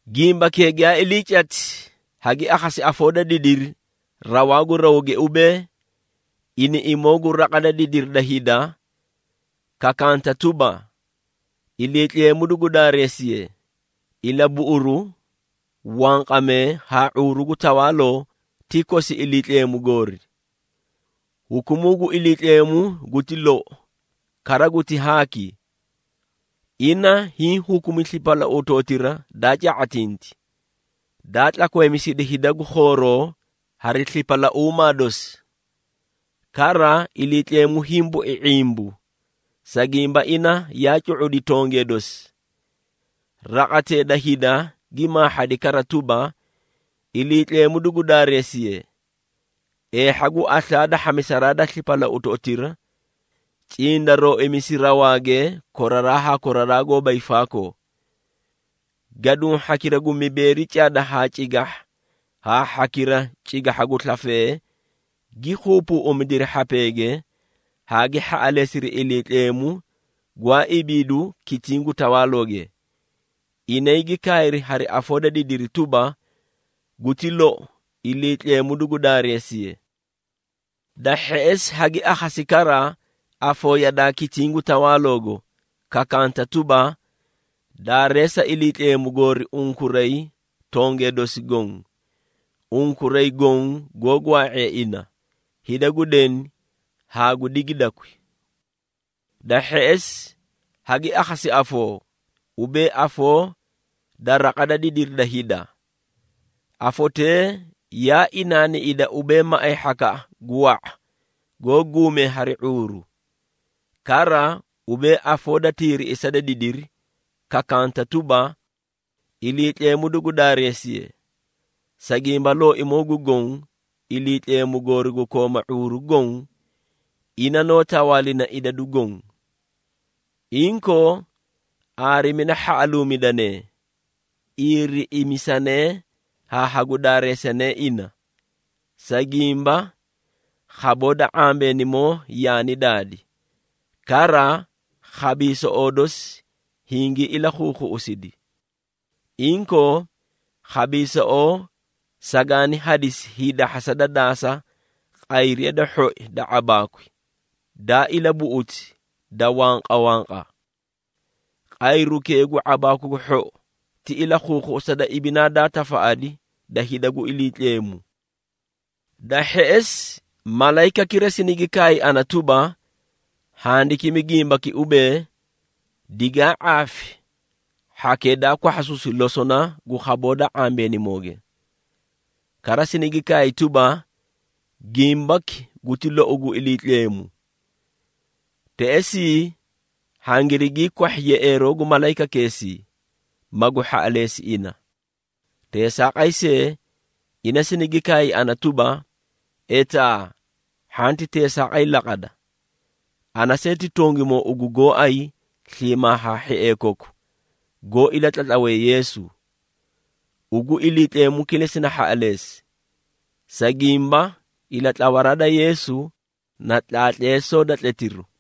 Gimbakee giyaa ilii cati, hagi akhasi afoo da didiri rawaa gu rawge ubee, iniꞌimoo gu raqa da didiri da hida, kakanta tuba, “Iliitleemu dugu daareesiye! Ilabuꞌuru, wanqamee haa ⁄uuru gu tawaaloo ti kosi Iliitleemu goori. Hukumuu gu Iliitleemu guti lou kara guti haaki. Ina hiĩ hukumi slipalautoꞌotira daa ca⁄atinti, daa tlakweemisidi hida gu khooroo hari slipalauumaa dosi. Kara, Iliitleemu hiĩ bui ⁄imbu, sa gimba ina yaa cu⁄udi tongee dosi.” Raqatee da hida gi maahhadi kara tuba, “Iliitleemu dugu daareesiye! Eehha gu aslaa da hhamisaraa slipalautoꞌotira, cindarooimisi rawaage koraraa haa koraraa goóba hiifaakoo.” Gaduũ hhakira gu mibeeri cada haa cigahha haa hhakira cigahha gu slafee, gi keebeeꞌemidiri hhapeege haa gi hhaꞌaleesiri Iliitleemu gwaa ibiidu kitiĩ gu tawaalooge. Inay gi kaayri hari afoo da didiri tuba, “Guti lou! Iliitleemu dugu daareesiye!” Da hheꞌesi, hagi akhasi kara afoo yadaa kitiĩ gu tawaaloogo, kakaanta tuba, “Daareesa Iliitleemu goori unkuray tongee dosi goõ, unkuray goõ goó gwaa⁄ee ina, hida gu deni haa gu digidakwi!” Da hheꞌesi, hagi akhasi afoo, ubee afoo da raqa da didiri da hida. Afotee yaa inaaniꞌida ubee maꞌay hhakaꞌa gu wa⁄a goó guumee hari ⁄uuru, kara ubee afoo da tiiriꞌisa da didiri, kakanta tuba, “Iliitleemu dugu daareesiye! Sa gimba, Looimoo gu Goõ, Iliitleemu goori gu kooma ⁄uuru goõ, ina noó tawaalina idadu goõ. Inkoo, aarimida hhaꞌaluumidanee, iiriꞌimisanee haa hagu daareesanee ina! Sa gimba, khaboo da ⁄ambeenimoo yaani daadi, kara khabiisoꞌoo dosi hingii ilakhuukhuꞌusidi. Inkoo, khabiisoꞌoo sagaani hadisi hiidahhasa da daasa qayriya da hhoi da ⁄abaakwi daa ilabuꞌuti da wanqawanqa.” Qayrukee gu ⁄abaaku gu hhou ti ilakhuukhuꞌusa da ibinaa daa tafaꞌadi da hida gu Iliitleemu. Da hheꞌesi, malayikakira sinigi kaay ana tuba, “Handikimi gimbaki ubee, ‘Digaa ⁄aafi hhakee daa kwahhasuusi losona gu khaboo da ⁄ambeenimooge!’” Kara sinigi kaay tuba, “Gimbaki guti lou gu Iliitleemu.” Teꞌesii, hangirigii kwahhi yeꞌeeroo gu malayikakeesii, magu hhaꞌaleesi ina. Teesaaqay see, ina sinigi kaay ana tuba, “Etaa hhanti teesaaqay laqada! Ana see ti tongimoo ugu gooay sliimaa haa hhiee koku, goó ilatlatlawee Yeesu. Ugu Iliitleemu kilesi na hhaꞌaleesi! Sa gimba, ilatlawaraa da Yeesu, na tlaatleesoo da tletiru.”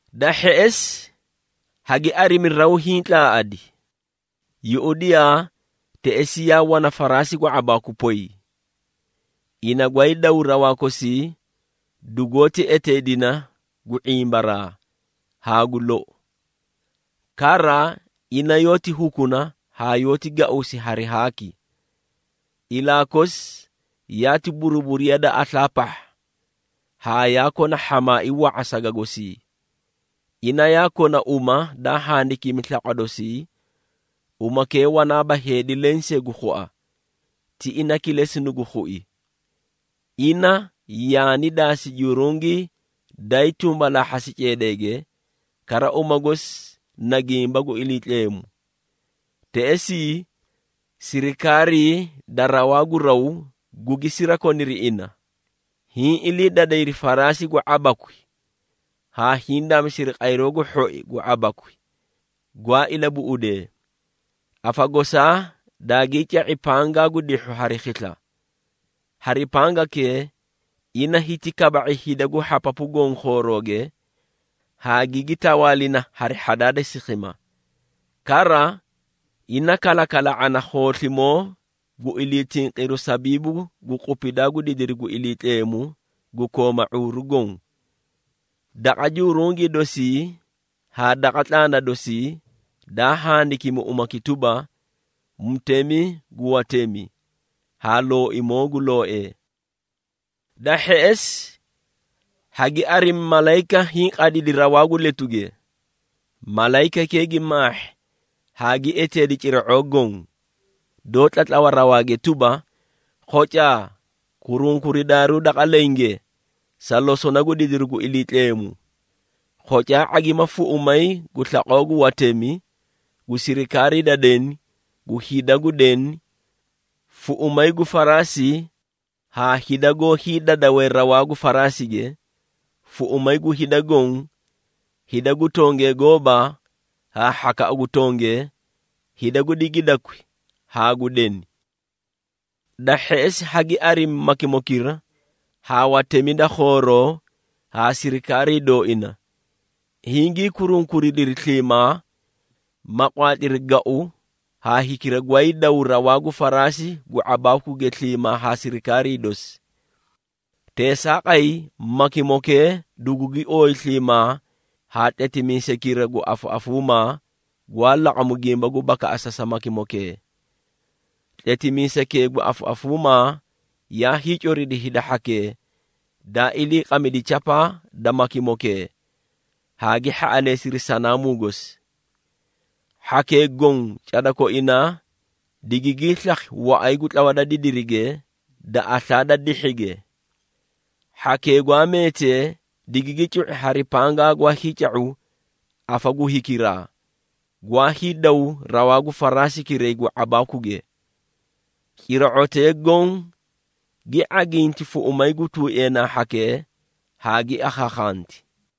Da hheꞌesi, hagi arimi raw hiĩ tlaaꞌadi. Yuꞌudiyaa, teꞌesii yaa wana faraasi gu ⁄abaaku poy! Ina gwaay daw rawaa kosii, dugoóti eteedina gu “⁄imbaraa” haa gu “Lou.” Kara ina yoóti hukuna haa yoóti gauusi hari haaki. Ilaa kosi yaati buruburiya da aslaa pahha, haa yaa kona hhamaai wa⁄a saga gosii. Ina yaa kona uma daa handikimi slaqwa dosii, umakee wanaaba heedi lensee gu khua, ti ina kilesi nugu khui. Ina yaani daasi jurungii daay tumbalaahhasi ceedeege, kara uma gosi na Gimba gu Iliitleemu. Teꞌesii, sirikaarii da rawaa gu raw gugi sirakoniri ina, hiĩ ilii dadayri faraasi gu ⁄abakwi haa hiĩ daamisiri qayroo gu hhoi gu ⁄abakwi gwaa ilabuꞌudee. Afa gosaa daagii ca⁄i pangaa gu dihhu hari khisla. Hari pangakee ina hiti kaba⁄i hida gu hhapapu goõ khoorooge, haa gigi tawaalina hari hhadaa da sikhima. Kara, ina kalakala⁄ana khooslimoo gu ilii tinqiruu sabiibu gu qupidaa gu didiri gu Iliitleemu gu kooma ⁄uuru goõ. Daqa jurungii dosii haa daqa tlaana dosii, daa handikimi umaki tuba, “Mutemi gu watemi haa Looimoo gu looee.” Da hheꞌesi, hagi arimi malayika hiĩ qadidi rawaa gu letuge. Malayikakee gi maahhi haa gi eteedi cira⁄oo goõ, doó tlatlawa rawaage tuba, “Khocaa, kurunkuridaaruu daqa lenge, sa losona gu didiru gu Iliitleemu. Khocaa ⁄agima fuꞌumay gu slaqoo gu watemi, gu sirikaarii da deni, gu hida gu deni, fuꞌumay gu faraasi haa hida goó hiidadawee rawaa gu faraasige, fuꞌumay gu hida goõ, hida gu tongee gooba haa hhakaꞌa gu tongee, hida gu digidakwi haa gu deni.” Da hheꞌesi, hagi arimi makimokira haa watemi da khooroo haa sirikaarii dooina, hingii kurunkuridiri sliimaa, ma qwaatliri gau haa hikira gwaay dawu rawaa gu faraasi gu ⁄abaakuge sliimaa haa sirikaarii dosi. Teesaaqay, makimokee dugugi ooyi sliimaa haa tletimiisaykira gu afaꞌafuumaa, gwaa laqamu gimba gu bakaꞌasa sa makimokee. Tletimiisaykee gu afaꞌafuuma yaa hiicoridi hida hhakee daa iliiqamidi chapaa da makimokee haa gi hhaꞌaleesiri sanaamuu gosi. Hhakee goõ cada koinaa digigii slakhi waꞌay gu tlawa da didirige da aslaa da dihhige. Hhakee gwaa meetee digigi cu⁄i hari pangaa gwaa hiica⁄u afa gu hikiraa, gwaa hiidaw rawaa gu faraasikiray gu ⁄abaakuge. Cira⁄otee goõ gi ⁄aginti fuꞌumay gu tuueenaa hhakee haa gi akhaakhanti.